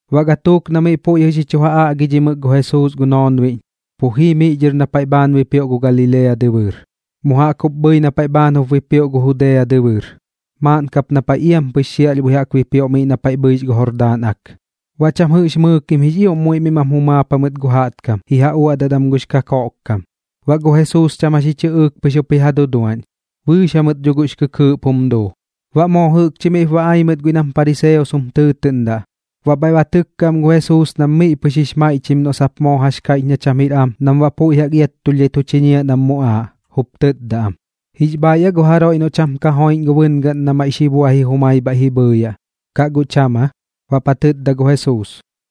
Baꞌ gatuuk na miꞌ puiꞌ jɨꞌ xi chu ja aꞌgidhimɨk gu Jesuus gu noonbiꞌñ, pu jii miꞌ dhɨr na paiꞌ bhaan bipioꞌ gu Galilea dɨbɨɨr, mu jaꞌk jup bhɨi na paiꞌ bhaan jup bipioꞌ gu Judea dɨbɨɨr, maaꞌn kap na paiꞌ iampɨx xiaꞌlhbui jaꞌk bipioꞌ miꞌ na paiꞌ bhɨix gu Jordaan Ak. Baꞌ cham jɨꞌx mɨɨkim jix ioꞌm muiꞌ miꞌ mam jumaap jamɨt gu jaꞌtkam ji ja uaꞌdat am gux kakoꞌkkam, baꞌ gu Jesuus cham jax ji chɨꞌɨɨk pɨx jaꞌx jup ji ja duduaꞌñ. Bɨɨx jamɨt dho guꞌx kɨɨꞌp jum duu. Baꞌ moo jɨꞌkchi miꞌp ba ai mɨt guiꞌ nam pariseos jum tɨɨtɨꞌndaꞌ, baꞌ bhaiꞌ ba tɨkka am gu Jesuus nam miꞌ pɨx jix maiꞌchim noꞌ sap moo jax kaiꞌch na cham jir am nam baꞌ puiꞌ jaꞌk iattulhdhai tu chiñiaꞌ nam muꞌaaꞌ, jup tɨtda am: ―¿Jix bhaaiꞌ aa gu jaroiꞌ noꞌ cham ka joiꞌñ gu bɨngaꞌn na maiꞌ xi buaji jumai bhaiꞌp ji bhɨɨyaꞌ, kaꞌ guꞌ cham aa? Baꞌp ja tɨtda gu Jesuus: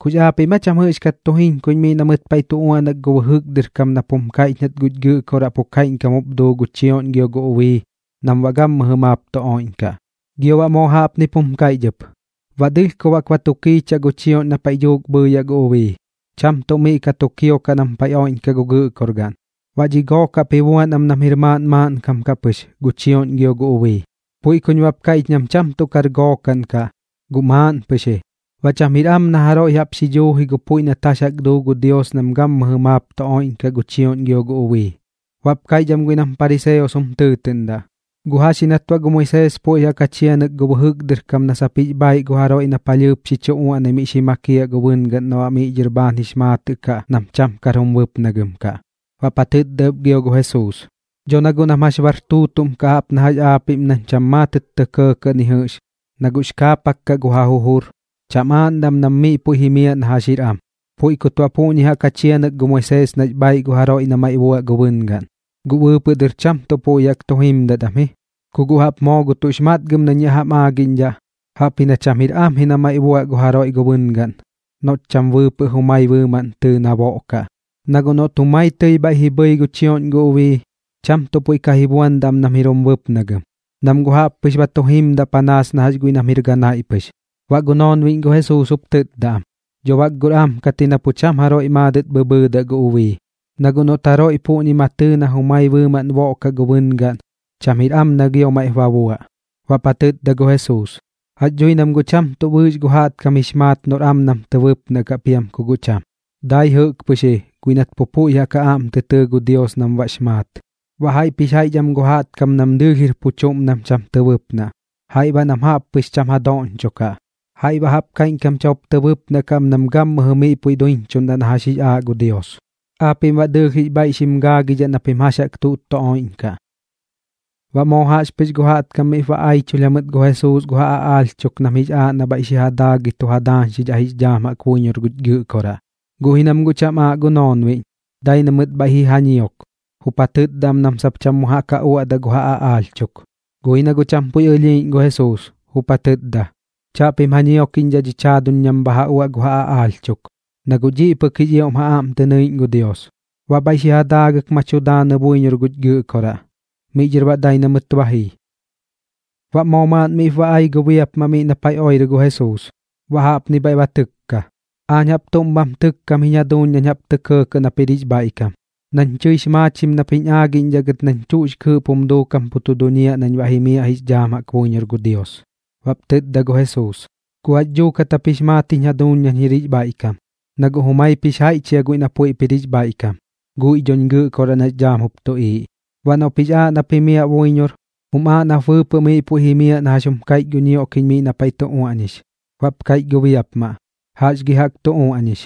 ―¿Kux aapiꞌm aa cham jɨꞌxkat tu jiñkuiꞌñ miꞌ na mɨt paiꞌ tu uaꞌnak gu bɨjɨk dɨr kam nap jum kaiꞌch nat guñ Gɨꞌkoraꞌ pu kaiꞌñkam jup duu gu chioꞌñ gio gu ubii nam baꞌ gammɨjɨ maap tu oiꞌñkaꞌ? Gio baꞌ moo jaꞌpnip jum kaiꞌch ɨp: “Baꞌ dɨlhkob jaꞌk ba tu kiichaꞌ gu chioꞌñ na paiꞌ dhuuk bhɨɨyaꞌ gu ubii, cham tuꞌ miꞌ ka tu kiokaꞌ nam paiꞌ oiꞌñkaꞌ gu gɨꞌkorgaꞌn. Baꞌ dhi gook jaꞌp ji buan am nam jir maaꞌn maaꞌnkam kaꞌ pɨx gu chioꞌñ gio gu ubii.” Puiꞌ kuñ baꞌp kaiꞌch nam cham tuꞌ kar gookaꞌn kaꞌ, guꞌ maaꞌn pɨx ji. Baꞌ cham jir am na jaroiꞌ jaꞌp xi dhuuji gu puiꞌ nat jax jaꞌk duu gu Dios nam gammɨjɨ maap tu oiꞌñkaꞌ gu chioꞌñ gio gu ubii. Baꞌp kaiꞌch am guiꞌ nam pariseos jum tɨɨtɨꞌndaꞌ: ―¿Guꞌ jax ji nat baꞌ gu Moisees puiꞌ jaꞌk ja chianɨk gu bɨjɨk dɨr kam na sap jix bhaaiꞌ gu jaroiꞌ na palhɨɨp xi chu uaꞌnai miꞌ xi makiaꞌ gu bɨngaꞌn na baꞌ miꞌ dhɨr bhaan jix maatɨꞌ kaꞌ nam cham kar jum bɨpnagɨm kaꞌ? Baꞌp ja tɨtda ɨp gio gu Jesuus: ―Dho na guꞌ nam jax bar tuutuꞌm kaꞌ jaꞌp na jax aapiꞌm nam cham maatɨt tɇ kɇɇkɇꞌ ni jɨꞌx, na guꞌx kaapak kaꞌ gu ja jujur, cham aaꞌndaꞌ am nam miꞌ puiꞌ jimiaꞌ na jax jir am. Puiꞌ kut baꞌ puꞌñi jaꞌk ja chianɨk gu Moisees nax bhaaiꞌ gu jaroiꞌ na maiꞌ buaꞌ gu bɨngaꞌn, guꞌ bɨɨpɨꞌ dɨr cham tuꞌ puiꞌ jaꞌk tu jimdat am ji. Ku guꞌ jaꞌp moo gu tuꞌx matgɨm nañ yaꞌ jam aagiꞌñdhaꞌ, jaꞌpji na cham jir am ji na maiꞌ buaꞌ gu jaroiꞌ gu bɨngaꞌn noꞌt cham bɨɨpɨꞌ jumai bɨɨmaꞌn tɨɨ na boꞌkaꞌ. Na guꞌ noꞌt jumai tɨi bhaiꞌ ji bhɨi gu chioꞌñ gu ubii, cham tuꞌ puiꞌ ka ji buandaꞌ am nam jir jum bɨpnagɨm, nam guꞌ jaꞌp pɨx ba tu jimdaꞌ panaas na jax guiꞌ nam jir ganaiꞌ pɨx. Baꞌ gu noonbiꞌñ gu Jesuus jup tɨtda am: ―Dho bak guꞌr am kat ji na pu cham jaroiꞌ maadɨt bhɨbhɨɨdaꞌ gu ubii, na guꞌ noꞌt jaroiꞌ puꞌñi ma tɨɨ na jumai bɨɨmaꞌn boꞌkaꞌ gu bɨngaꞌn, cham jir am na gio maiꞌp ba buaꞌ. Baꞌp ja tɨtda gu Jesuus: ―Jax dhui nam guꞌ cham tuꞌ bɨɨx gu jaꞌtkam jix maat noꞌr am nam tɨ bɨpnaꞌ kaꞌ piam ku guꞌ cham, dai jɨꞌk pɨx ji guiꞌ nat pu puiꞌ jaꞌk ja aꞌm tɨ tɨɨ gu Dios nam baꞌx maat. Baꞌ jaiꞌp jix jaiꞌch am gu jaꞌtkam nam dɨɨlh jir pu chuꞌm nam cham tɨ bɨpnaꞌ kaꞌ, jaiꞌ baꞌ nam jaꞌp pɨx cham ja doꞌñchokaꞌ, jaiꞌ baꞌ jaꞌp kaiꞌñkam cham jup tɨ bɨpnaꞌ kaꞌ am nam gammɨjɨ miꞌ puiꞌ duiñchuꞌndaꞌ na jax jaꞌk jix aaꞌ gu Dios. Aapiꞌm baꞌ dɨɨlh jix bhaiꞌ xim gaagidhaꞌ na pim jax jaꞌk tuꞌt tu oiꞌñkaꞌ. Baꞌ moo jaꞌxpɨx gu jaꞌtkam miꞌp ba aichulh jamɨt gu Jesuus gu ja aꞌaalh chuk nam jix aaꞌ na bhaiꞌ xi ja daagɨi tu ja daañxidhaꞌ jix dhaam jaꞌk buiñor guch Gɨꞌkoraꞌ. Guꞌ ji nam guꞌ cham aaꞌ gu noonbiꞌñ, dai na mɨt bhaiꞌ ji ja ñiok, jup ja tɨtda am nam sap cham mu jaꞌk ja uaꞌdaꞌ gu ja aꞌaalh chuk. Guꞌ ji na guꞌ cham puiꞌ ɨlhiiꞌñ gu Jesuus, jup ja tɨtda: ―Chaꞌpim ja ñiokiꞌñdhaꞌ dhich jaaduñ nam bha ja uaꞌ gu ja aꞌaalh chuk, na guꞌ dhiꞌ pɨk jix ioꞌm ja aꞌm tɨ nɨiꞌñ gu Dios. Baꞌ bhaiꞌ xi ja daagɨk ma tu daanɨ buiñor guch Gɨꞌkoraꞌ. Miꞌ dhɨr baꞌ dai nat ba jii. Baꞌ moo maaꞌn miꞌp ba ai gu biapmaꞌ miꞌ na paiꞌ oirɨ gu Jesuus, baꞌ jaꞌpni bhaiꞌ ba tɨkka: ―Aañ jaꞌp tuꞌm bham tɨkkam jiñ jaduuñ nañ jaꞌp tɇ kɇɇ nap jir jix bhaiꞌkam, nañ tɨix maachim nap jiñ aagiꞌñdhaꞌ gɨt nañ tuꞌx kɨɨꞌp jum duukam pu duñiaꞌ nañ baꞌ jimiaꞌ jix dhaam jaꞌk buiñor gu Dios. Baꞌp tɨtda gu Jesuus: ―¿Guꞌ jax duukat jap jix maat jiñ jaduuñ nañ jir jix bhaiꞌkam? Na guꞌ jumaip jix jaiꞌch jia guiꞌ na puiꞌp jir jix bhaiꞌkam, guiꞌ dhoñ Gɨꞌkoraꞌ nax dhaam jup tuꞌiiꞌ. Baꞌ noꞌp jix aaꞌ nap jimiaꞌ buiñor, jum aaꞌ nap bɨɨpɨꞌ miꞌ puiꞌ jimiaꞌ na jax jum kaiꞌch gu ñioꞌkiꞌñ miꞌ na paiꞌ tu uaꞌñix. Baꞌp kaiꞌch gu biapmaꞌ: ―¿Jax gi jaꞌk tu uaꞌñix?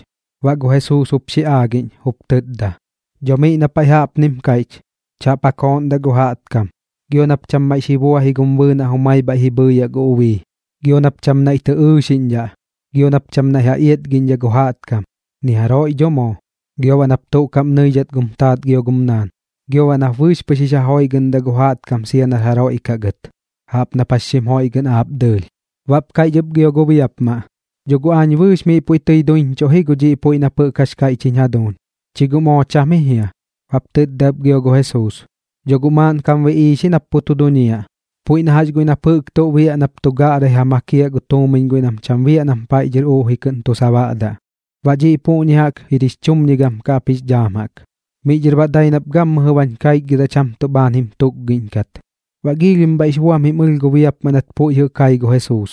Baꞌ gu Jesuus jup xi aagiꞌñ jup tɨtda: ―Dho miꞌ na paiꞌ jaꞌpnim kaiꞌch: “Chaꞌp ja kooꞌndaꞌ gu jaꞌtkam. Gio nap cham maiꞌ xi buaji gum bɨɨnaꞌ jumai bhaiꞌ ji bhɨɨyaꞌ gu ubii. Gio nap cham naiꞌ tɨ ɨɨxiꞌñdhaꞌ. Gio nap cham naiꞌ ja iatgiꞌñdhaꞌ gu jaꞌtkam, ni jaroiꞌ dho moo. Gio baꞌ nap tuꞌ kaꞌm nɨidhat gum taat gio gum naan. Gio baꞌ nap bɨɨx pɨx jix ja joiꞌgɨꞌndaꞌ gu jaꞌtkam sia nar jaroiꞌ kaꞌ gɨt, jaꞌp nap jax xim joiꞌgɨꞌndaꞌ aap dɨɨlh.” Baꞌp kaiꞌch ɨp gio gu biapmaꞌ: ―Dho guꞌ aañ bɨɨx miꞌ puiꞌ tɨi duiñchuꞌ ji gu dhiꞌ puiꞌ nap jɨꞌk jax kaiꞌch jiñ jaduuñ. ¿Chi guꞌ moo cham ji jia? Baꞌp tɨtda ɨp gio gu Jesuus: ―Dho guꞌ maaꞌn kam biꞌiix ji nap pu tu duñiaꞌ, puiꞌ na jax guiꞌ nap jɨꞌk tuꞌ biaꞌ nap tu gaꞌrai ja makiaꞌ gu tuumiñ guiꞌ nam cham biaꞌ nam paiꞌ dhɨr uꞌji kɨꞌn tu sabaꞌdaꞌ. Baꞌ dhiꞌ puꞌñi jaꞌk jir jix chumñigam kaꞌ ap jix dhaam jaꞌk. Miꞌ dhɨr baꞌ dai nap gammɨjɨ bañ kaichgɨdaꞌ cham tuꞌ bhaan jim tukgidhat. Baꞌ giilhim bhaiꞌx buam jim ɨlh gu biapmaꞌ nat puiꞌ jɨꞌ kai gu Jesuus,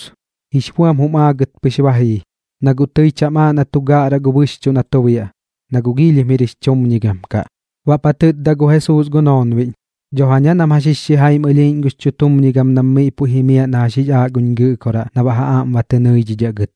jix buam jum aagɨt pɨx ba jii, na guꞌ tɨi cham aaꞌ na tu gaꞌraꞌ gu bɨxchuꞌ na tu biaꞌ, na guꞌ giilhim jir jix chumñigam kaꞌ. Baꞌp ja tɨtda gu Jesuus gu noonbiꞌñ: ―Dho jaña nam jax jix xijaim ɨlhiiꞌñ gux chutumñigam nam miꞌ puiꞌ jimiaꞌ na jax jix aaꞌ guñ Gɨꞌkoraꞌ na baꞌ ja aꞌm ba tɨ nɨidhidhaꞌ gɨt.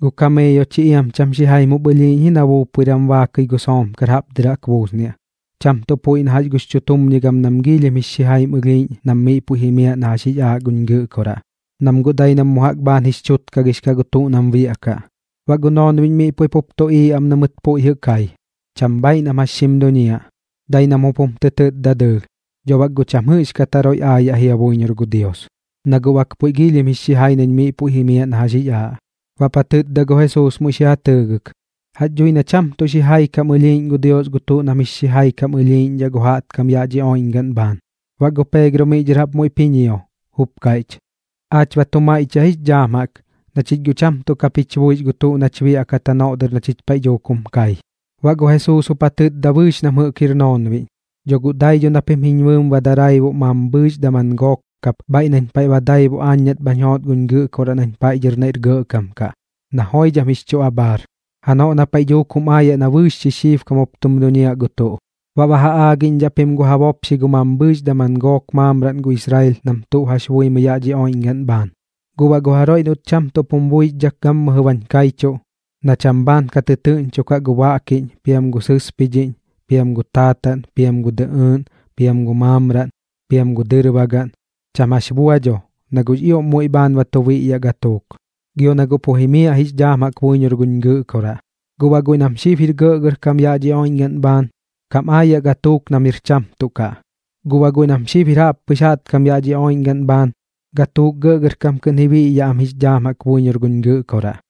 Gu kameeyo chi iam cham xijaim jup ɨlhiiꞌñ ji na buupuiram baakɨi gu soomkar jaꞌp dɨr jaꞌk buusniaꞌ, cham tuꞌ puiꞌ na jax gux chutumñigam nam giilhim jix xijaim ɨlhiiꞌñ nam miꞌ puiꞌ jimiaꞌ na jax jix aaꞌ guñ Gɨꞌkoraꞌ, nam guꞌ dai mu jaꞌk bhaan jix chutkagix kaꞌ gu tuꞌ nam biaꞌkaꞌ. Baꞌ gu noonbiꞌñ miꞌ puiꞌ pup tuꞌiiꞌ am na mɨt puiꞌ jɨꞌ kai, cham bhaaiꞌ nam jax xim duñiaꞌ, dai nam jup jum tɨ tɨtda dɨɨlh: ―Dho bak guꞌ cham jɨꞌxkat jaroiꞌ aayaꞌ ji buiñor gu Dios, na guꞌ bak puiꞌ giilhim jix xijai nañ miꞌ puiꞌ jimiaꞌ na jax jix aaꞌ. Baꞌp ja tɨtda gu Jesuus muiꞌ xi ja tɨɨgɨk: ―Jax dhui na cham tuꞌ xijai kam ɨlhiiꞌñ gu Dios gu tuꞌ nam jix xijai kam ɨlhiiꞌñdhaꞌ gu jaꞌtkam yaꞌ dhi oiꞌñgaꞌn bhaan. Baꞌ gu Peegro miꞌ dhɨr jaꞌp muiꞌp ji ñio, jup kaiꞌch: ―¿Aach baꞌ tuꞌ maiꞌchiaꞌ jix dhaam jaꞌk, na chich guꞌ cham tuꞌ kap jich buix gu tuꞌ nach biaꞌkat janoꞌ dɨr na chich paiꞌ dhuuk jum kai? Baꞌ gu Jesuus jup ja tɨtda bɨɨx nam jɨꞌk jir gu noonbiꞌñ: ―Dho guꞌ dai dho na pim jiñ bɨɨm ba daraibuꞌ mambhɨɨx kap daman gook bhaiꞌ nañ paiꞌ ba daibuꞌ aañ nat bhañ joot guñ Gɨꞌkoraꞌ nañ paiꞌ dhɨr naiꞌr gɇꞌkam kaꞌ, na joidham jix chu abhaar, janoꞌ na paiꞌ dhuuk jum aayaꞌ na bɨɨx xixiibkam jup tum duñiaꞌ gu tuꞌ. Baꞌ ba ja aagiꞌñdhaꞌ pim gu ja bopxi gu mambhɨɨx daman gook maamraꞌn gu Israel nam tuꞌ jax buimɨi yaꞌ dhi oiꞌñgaꞌn bhaan. Guꞌ baꞌ gu jaroiꞌ noꞌt cham tuꞌp jim buixdhak gammɨjɨ bañ kaichuꞌ, na cham bhaan ka tɨtɨɨꞌñchokaꞌ gu baꞌkiꞌñ, piam gu sɨspidhiꞌñ, piam gu taataꞌn, piam gu dɨꞌɨɨꞌn, piam gu maamraꞌn, piam gu dɨrbagaꞌn, cham jax bua dho, na guꞌx ioꞌm muiꞌ bhaan ba tu biꞌyaꞌ gatuuk, gio na pu jimiaꞌ jix dhaam jaꞌk buiñor guñ Gɨꞌkoraꞌ. Guꞌ baꞌ guiꞌ nam xib jir gɇꞌgɇrkam yaꞌ dhi oiꞌñgaꞌn bhaan, kam aayaꞌ gatuuk nam jir cham tuꞌ kaꞌ, guꞌ baꞌ guiꞌ nam xib jir jaꞌppɨx jaꞌtkam yaꞌ dhi oiꞌñgaꞌn bhaan, gatuuk gɇꞌgɇrkam kɨꞌn ji biꞌyaꞌ am jix dhaam jaꞌk buiñor guñ Gɨꞌkoraꞌ.